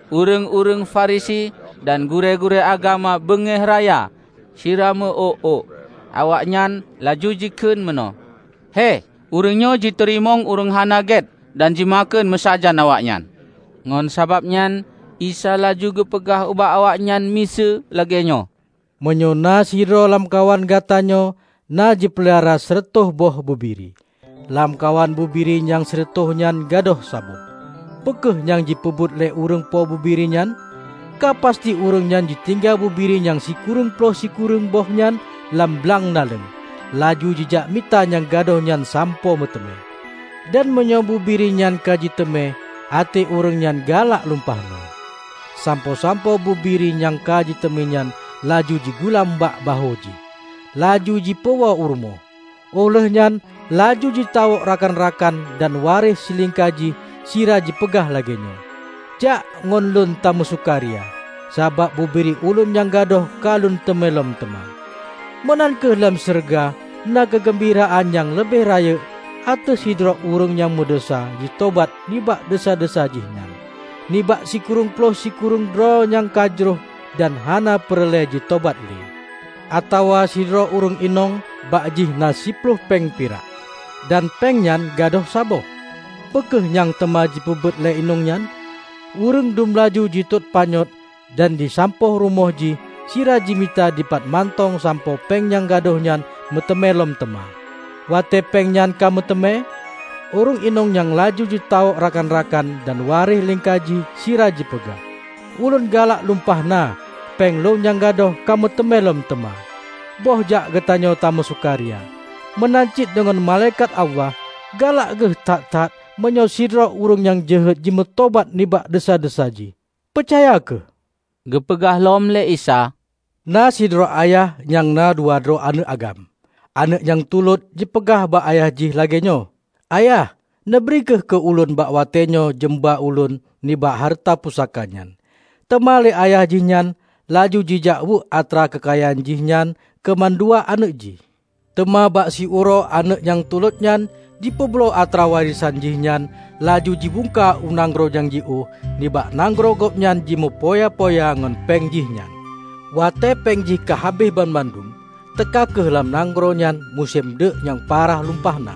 Ureuëng-ureuëng Farisi dan gurée-gurée agama beungéh raya sira meuôk-ôk. Awaknyan laju jikheun meunoe, "Héh, ureuëng nyoe jiteurimong ureuëng hana gét dan jimakheun meusajan awaknyan!" Ngon sabab nyan Isa laju geupeugah ubak awaknyan miseue lagée nyoe, "Meunyoe na sidroe lamkawan gata nyoe na jipeulara sireutôh boh bubiri, lamkawan bubiri nyang sireutôh nyan gadôh saboh -- peu kheueh nyang jipeubuet lé ureuëng po bubiri nyan? Ka pasti ureuëng nyan jitinggai bubiri nyang sikureueng ploh sikureueng boh nyan lam blang naleueng, laju jijak mita nyang gadôh nyan sampoe meuteumé. Dan meunyoe bubiri nyan ka jiteumé, até ureuëng nyan galak lumpah na sampoe-sampoe bubiri nyang ka jiteumé nyan laju jigulam bak bahô jih, laju jipeuwoe u rumoh. Óh lheuehnyan laju jitawök rakan-rakan dan waréh silingka jih sira jipeugah lagée nyoe, 'Jak ngon lôn tameusukaria. Sabab bubiri ulôn nyang gadôh ka lôn teumé lom teuma!' Meunan kheueh lam syeuruga na keugeumbiraan nyang leubeh rayeuk ateueh sidroe ureuëng nyang meudesya jitobat nibak desya-desya jih nyan, nibak sikureueng ploh sikureueng droe nyang ka jroh dan hana peureulée jitobat le." "Atawa sidroe ureuëng inong bak jih na siploh péng pirak, dan péng nyan gadôh saboh -- peu kheueh nyang teuma jipeubuet lé inong nyan? Ureuëng dum laju jitot panyöt dan jisampôh rumoh jih sira jimita dipat mantong sampoe péng nyang gadôh nyan meuteumé lom teuma. Watée péng nyan ka meuteumé, ureuëng inong nyang laju jitawök rakan-rakan dan waréh lingka jih sira jipeugah, 'Ulôn galak lumpah na péng lôn nyang gadôh ka meuteumé lom teuma. Bôh jak geutanyoe tameusukaria!' Meunan cit deungon malaikat Allah galak geuh that-that meunyoe sidroe ureuëng nyang jeuhet jimeutobat nibak desya-desya jih. Peucaya kheueh!" Geupeugah lom lé Isa, "Na sidroe ayah nyang na dua droe aneuëk agam. Aneuëk nyang tulot jipeugah bak ayah jih lagée nyoe, 'Ayah, neubri kheueh keu ulôn bak watée nyoe jeumba ulôn nibak hareuta pusaka nyan.' Teuma lé ayah jihnyan laju jijakweuek atra keukayaan jih nyan keu mandua aneuëk jih. Teuma bak siuroe aneuëk nyang tulot nyan jipeubloe atra warésan jih nyan laju jibungka u nanggroe nyang jiôh. Nibak nanggroe gobnyan jimeupoya-poya ngon péng jihnyan. Watée péng jih ka habéh banmandum, teuka kheueh lam nanggroe nyan musém deuk nyang parah lumpah na,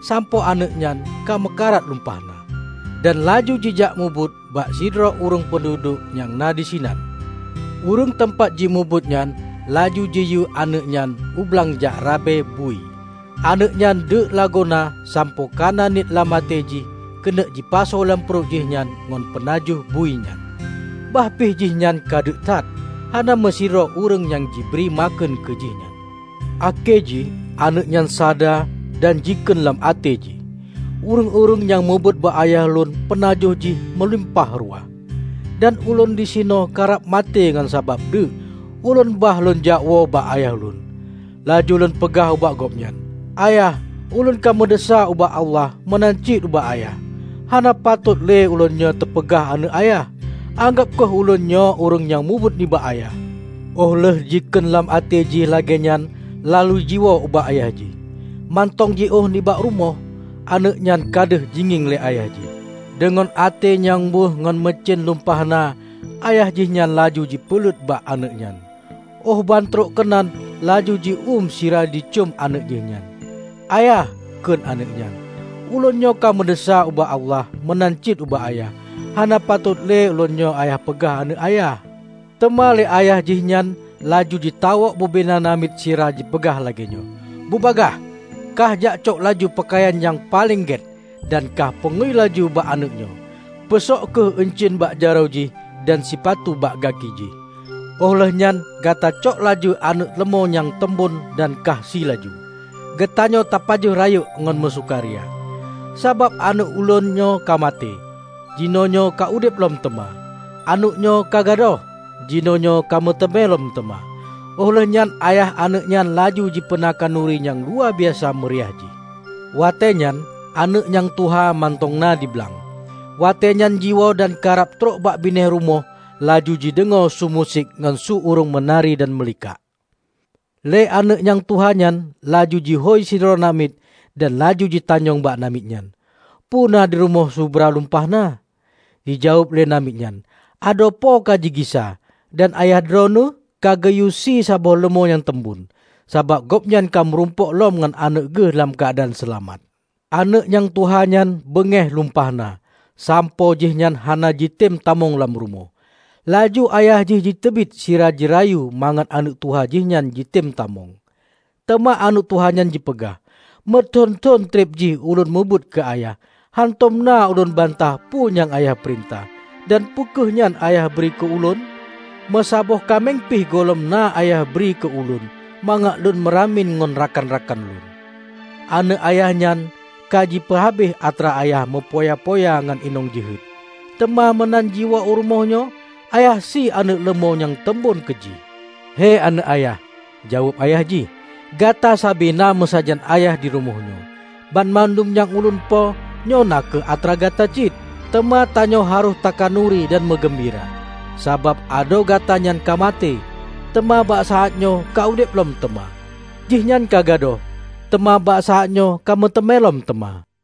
sampoe aneuëk nyan ka meukarat lumpah na. Dan laju jijak mubuet bak sidroe ureuëng peunduduek nyang na disinan, ureuëng teumpat jimubuet nyan laju jiyue aneuëk nyan ublang jak rabe bui. Aneuëk nyan deuk lagoena sampoe kana niet lam até jih keuneuk jipasoe lam pruet jihnyan ngon peunajoh bui nyan. Bah pih jihnyan ka deuk that, hana meusidroe ureuëng nyang jibri makheun keu jih nyan. Akhé jih aneuëk nyan sada dan jikheun lam até jih, 'Ureuëng-ureuëng nyang meubuet bak ayah lôn peunajoh jih meulimpah ruwah, dan ulôn disinoe karab maté ngon sabab deuk! Ulôn bah lôn jakwoe bak ayah lôn, laju lôn peugah ubak gobnyan: Ayah, ulôn ka meudesya ubak Allah meunan cit ubak Ayah. Hana patot le ulôn nyoe teupeugah aneuëk Ayah. Anggab kheueh ulôn nyoe ureuëng nyang mubuet nibak ayah.' Óh lheueh jikheun lam até jih lagée nyan laju jiwoe ubak ayah jih. Mantong jiôh nibak rumoh, aneuëk nyan ka deuh jingieng lé ayah jih. Deungon até nyang wéueh ngon meucén lumpah na ayah jihnyan laju jipeulet bak aneuëk nyan, óh bantrok keunan laju ji uem sira jicöm aneuëk jih nyan. 'Ayah,' kheun aneuëk nyan, 'ulôn nyoe ka meudesya ubak Allah meunan cit ubak Ayah. Hana patot le ulôn nyoe ayah peugah aneuëk Ayah.' Teuma lé ayah jihnyan laju jitawök bubena namiet sira jipeugah lagée nyoe, 'Bubagaih, kahjakcok laju peukayan nyang paleng gét, dan kah peungui laju bak aneuëk nyoe. Peusok kheueh euncien bak jaroe jih, dan sipatu bak gaki jih. Óh lheueh nyan gatacok laju aneuëk leumô nyang teumbon dan kahsie laju. Geutanyoe tapajoh rayeuk ngon meusukaria. Sabab aneuëk ulôn nyoe ka maté, jinoenyoe ka udeb lom teuma; aneuëk nyoe ka gadôh, jinoenyoe ka meuteumé lom teuma.' Óh lheuehnyan ayah aneuëk nyan laju jipeuna khanuri nyang luwabiasa meuriah jih. Watée nyan, aneuëk nyang tuha mantong na di blang. Watéenyan jiwoe dan karab trok bak binéh rumoh, laju jideungoe su musik ngon su ureuëng meunari dan meulikak. Lé aneuëk nyang tuha nyan laju jihôi sidroe namiet dan laju jitanyong bak namiet nyan, 'Peue na dirumoh subra lumpah na?' Jijaweueb lé namiet nyan, 'Adoe Po kajigisa! Dan ayah Droeneueh kageuyue sie saboh leumô nyang teumbon, sabab gobnyan kameurumpok lom ngon aneuëk geuh lam keuadaan seulamat!' Aneuëk nyang tuha nyan beungéh lumpah na sampoe jihnyan hana jitem tamong lam rumoh. Laju ayah jih jiteubiet sira jirayu mangat aneuëk tuha jihnyan jitem tamong. Teuma aneuëk tuha nyan jipeugah, 'Meuthon-thon treb jih ulôn mubuet keu Ayah. Hántom na ulôn bantah peu nyang Ayah peurintah. Dan peue kheueh nyan Ayah bri keu ulôn? Meusaboh kaméng pih gohlom na Ayah bri keu ulôn mangat lôn meuramien ngon rakan-rakan lôn! Aneuëk Ayah nyan ka jipeuhabéh atra Ayah meupoya-poya ngon inong jeuhet, teuma meunan jiwoe u rumoh nyoe, Ayah sie aneuëk leumô nyang teumbon keu jih!' 'Hei aneuëk Ayah,' jaweueb Ayah jih, 'gata sabe na meusajan Ayah dirumoh nyoe. Banmandum nyang ulôn po nyoe na kheueh atra gata cit. Teuma tanyoe harôh takhanuri dan meugeumbira, sabab adoe gata nyan ka maté, teuma bak saát nyoe ka udeb lom teuma; jihnyan ka gadôh, teuma bak saát nyoe ka meuteumé lom teuma.' "